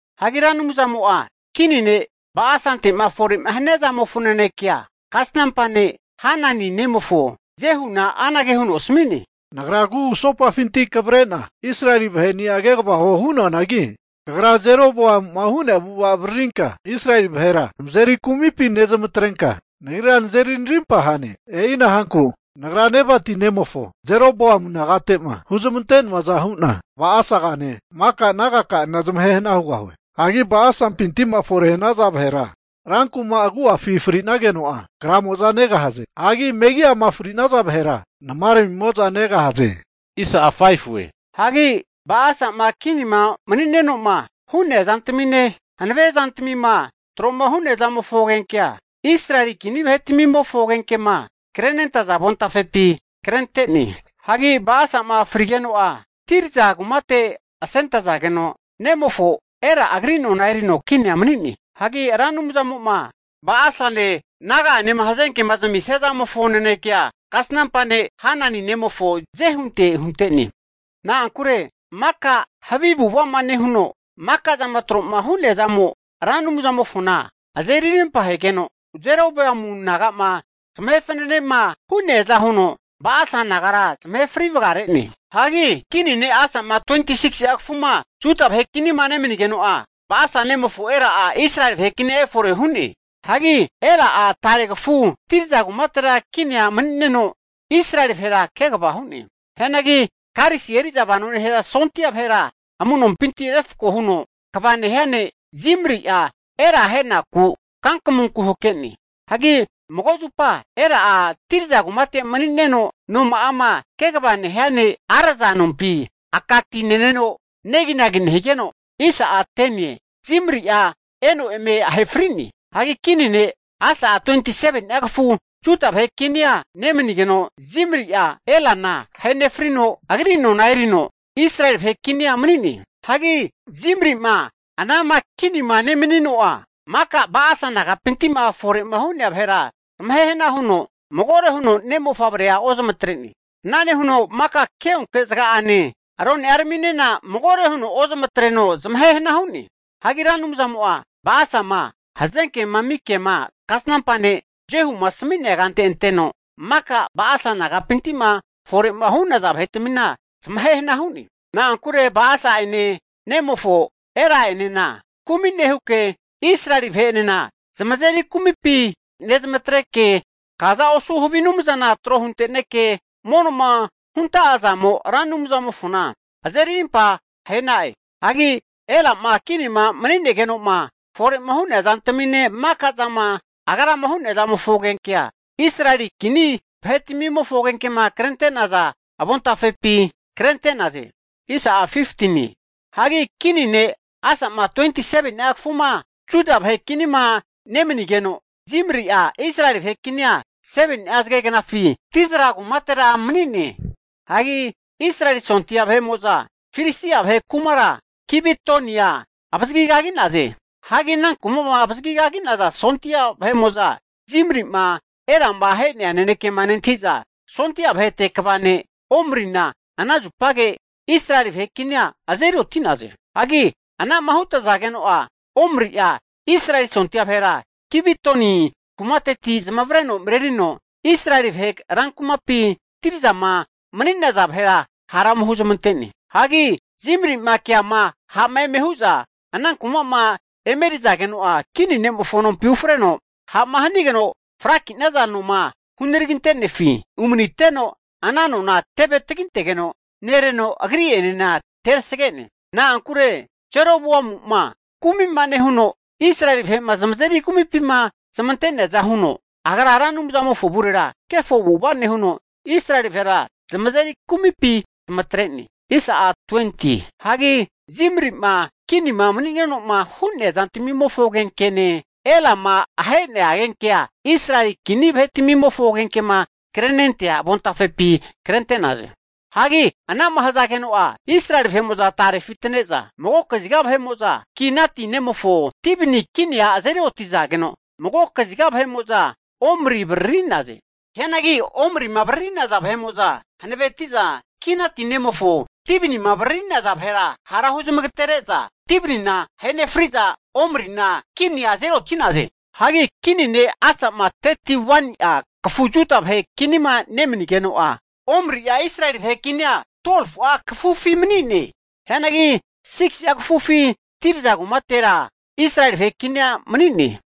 Hagi Ra Anumzamo'a kini ne' Ba'asante'ma fore'ma hania zamofo nanekea, kasnampa ne' Hanani nemofo Jehuna anage huno asami'ne, Nagra kugusopafinti kavre'na Israeli vahe'ni'a kegava huo hu'noanagi, kagra Jeroboamu'ma hu'nea avu'ava avaririnka Israeli vahera zamazeri kumipi nezmantrenka, Nagrira nazeri narimpa hane. E'ina hanku Nagra Nebati nemofo Jeroboamu nagate'ma huzmante'noaza hu'na Ba'asagane maka nagaka'anena zamahe hana hugahue. Hagi Ba'asampiti'ma fore'ma hanaza vahera rankuma agu'afima fri'nageno'a, kramo'za negahaze. Hagi megi'ama fri'nazana vahera namaramimo'za negahaze. Hagi Ba'asa'ma kinima mani'neno'ma hu'nea zantamine, hanave zantamima tro'ma hu'nea zamofo agenkea Israeli kini vahetmimofo agenkema krenentaza avontafepi krente'ne. Hagi Ba'asa'ma frigeno'a Tirza kumate asentazageno, nemofo Ela agri nona erino kinia mani'ne. Hagi Ra Anumzamo'ma Ba'asane naga'anema hazenke zamisia zamofo nanekea kasnampa ne' Hanani nemofo Jehunte hunte'ne. Na'ankure maka havi avu'ava'ma nehuno, maka'zama tro'ma hu'neazamo Ra Anumzamofona azeri arimpa ahegeno, Jeroboamu naga'ma zamahe fananema hu'neaza huno Ba'asa nagara zamahe fri vagare'ne. Hagi kini ne' Asa'ma 26si'a kafuma Juda vahe kinima nemanigeno'a, Ba'asa nemofo Ela'a Israeli vahe kinia efore hu'ne. Hagi Ela'a tare kafu Tirza kumatera kinia mani'neno, Israeli vahera kegava hu'ne. Hianagi karisi eri'za vano nehaza sondia vahera amu'nompinti refko huno kva nehia ne' Zimri'a Ela ahenaku kankamunku hake'ne. Hagi mago zupa Ela'a Tirza kumate mani'neno, noma'ama kegava nehia ne' Arza nompi aka ti neneno neginagi nehigeno, Zimri'a eno eme ahe fri'ne. Hagi kini ne' Asa'a 27ni'a kafu Juda vahe kinia nemanigeno, Zimri'a Elana ahe nefrino, agri nona erino Israeli vahe kinia mani'ne. Hagi Zimri'ma anama kinima nemanino'a, maka Ba'asa nagapinti'ma fore'ma hu'nea vahera zamahe hana nehuno magore huno ne' mofavrea ozamatre'ne. Ana nehuno maka keonke zaga'ane, rone'araminena magore huno ozamatreno zamahe hana hu'ne. Hagi Ra Anumzamo'a Ba'asama hazenkema ami kema kasnampa ne' Jehuma asami'nea kante anteno, maka Ba'asa nagapinti'ma fore'ma hu'naza vahetmina zamahe hana hu'ne. Na'ankure Ba'asa'ene nemofo Ela'enena kumi nehuke, Israeli vahe'enena zamazeri kumipima nezmantreke, kaza osu havi anumzana tro hunte'neke, mono'ma hunta'azamo'a Ra Anumzamofona azeri arimpa ahe'na'e. Hagi Ela'ma kinima mani'negeno'ma fore'ma hu'nea zantamine, maka zama agrama hu'nea zamofo agenkea Israeli kini vahetmimofo agenkema krente'naza avontafepi krente'naze. Hagi kini ne' Asa'ma 27ni'a kafuma Juda vahe kinima nemanigeno, Zimri'a Israeli vahe kinia 7ni'a zagegnafi Tirza kumatera mani'ne. Hagi Israeli sondia vahe'mo'za Filistia vahe kumara Gibetonia avazagigagi'naze. Hagi ana kuma'ma avazagigagi'naza sondia vahe'mo'za Zimri'ma Elama ahea nanekema nentahiza, sondia vahete kva ne' Omrina ana zupage Israeli vahe kinia azeri oti'naze. Hagi ana'ma hutazageno'a, Omri'a Israeli sondia vahera Gibetoni kumateti zamavareno marerino Israeli vahe rankumapi Tirzama mani'naza vahera hara ome huzmante'ne. Hagi Zimri'ma keama ha'ma eme hu'za ana kuma'ma emerizageno'a, kini ne'mofo nompi ufreno ha'ma hanigeno fraki'naza noma hunaraginte'nefi umaniteno, ana nona teve tagintegeno nereno agri'enena terasge'ne. Na'ankure Jeroboamu'ma kumi'ma nehuno, Israeli vahe'ma zamazeri kumipima zmante'neaza huno, agra Ra Anumzamofo avurera kefo avu'ava nehuno, Israeli vahera zamazeri kumipi zamatre'ne. Hagi Zimri'ma kinima mani'neno'ma hu'nea zantmimofo agenkene, Elama ahenea agenkea Israeli kini vahetmimofo agenkema krenentea avontafepi krente'naze. Hagi ana'ma hazageno'a, Israeli vahe'mo'za tarefi atane'za magokaziga Ginati nemofo Tibni kinia azeri otizageno, mago kagiza Omri avariri'naze. Hianagi Omrima avaririza hanaveti'za Ginati nemofo Tibnima avariri'naza vahera hara huzmagatere'za, Tibnina ahe nefriza Omrina kinia azeri oti'naze. Hagi kini ne' Asa'ma 31ni'a kafu Juda vahe kinima nemanigeno'a, Omri'a Israeli vahe kinia 12fu'a kafufi mani'ne. Hianagi 6si'a kafufi Tirza kumatera Israeli vahe kinia mani'ne.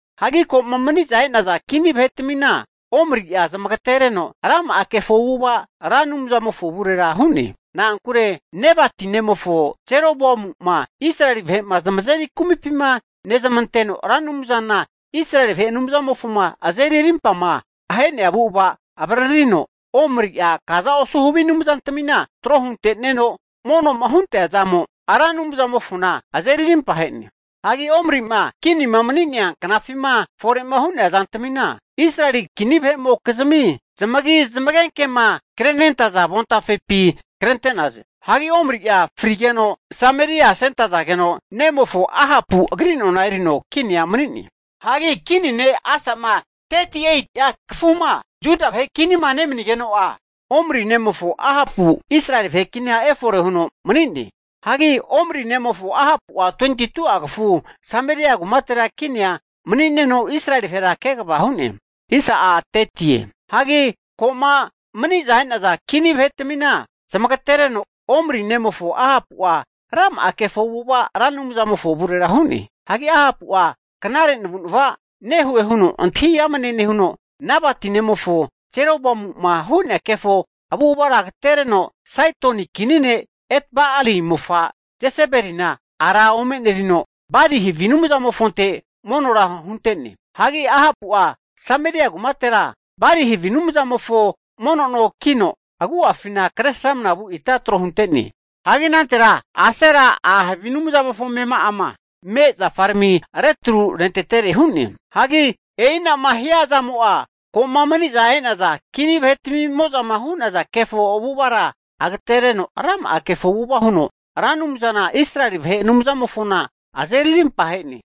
Hagi ko'ma maniza e'naza kini vahetmina Omri'a zamagatereno, rama'a kefo avu'ava Ra Anumzamofo avurera hu'ne. Na'ankure Nebati nemofo Jeroboamu'ma Israeli vahe'ma zamazeri kumipima nezamanteno Ra Anumzana Israeli vahe Anumzamofoma azeri arimpama ahe'nea avu'ava avaririno, Omri'a kaza osu havi anumzantmina tro hunte'neno mono'ma huntea zamo Ra Anumzamofona azeri rimpahe'ne. Hagi Omri'ma kinima mani'nea knafima fore'ma hu'nea zantamina Israeli kini vahe'mokizmi zamagi zamagenkema krenentaza avontafepi krente'naze. Hagi Omri'a frigeno Sameria asentazageno, nemofo Ahapu agri nona erino kinia mani'ne. Hagi Kini ne' Asa'ma 38'a kafuma Juda vahe kinima nemanigeno'a, Omri nemofo Ahapu Israeli vahe kinia efore huno mani'ne. Hagi Omri nemofo Ahapu'a 22'a kafu Sameria kumatera kinia mani'neno Israeli vahera kegava hu'ne. Hagi ko'ma maniza e'naza kini vahetmina zamagatereno, Omri nemofo Ahapu'a rama'a kefo avu'ava Ra Anumzamofo avurera hu'ne. Hagi Ahapu'a knare navu'nava nehue huno antahi amne nehuno, Nebati nemofo Jeroboamu'ma hu'nea kefo avu'avara agatereno, Saidoni kini ne' Etba'ali mofa' Jesebelina ara omenerino, Bali havi anumzamofonte monora hunte'ne. Hagi Ahapu'a Sameria kumatera Bali havi anumzamofo mono no kino, agu'afina kresramna vu ita tro hunte'ne. Hagi anantera Asera a' havi anumzamofo amema'ama me' zafarami retru rentetere hu'ne. Hagi e'ina'ma hia zamo'a, ko'ma maniza e'naza kini vahetmimo'zama hu'naza kefo avu'avara agatereno, rama'a kefo avu'ava huno Ra Anumzana Israeli vahe Anumzamofona azeri arimpa ahe'ne.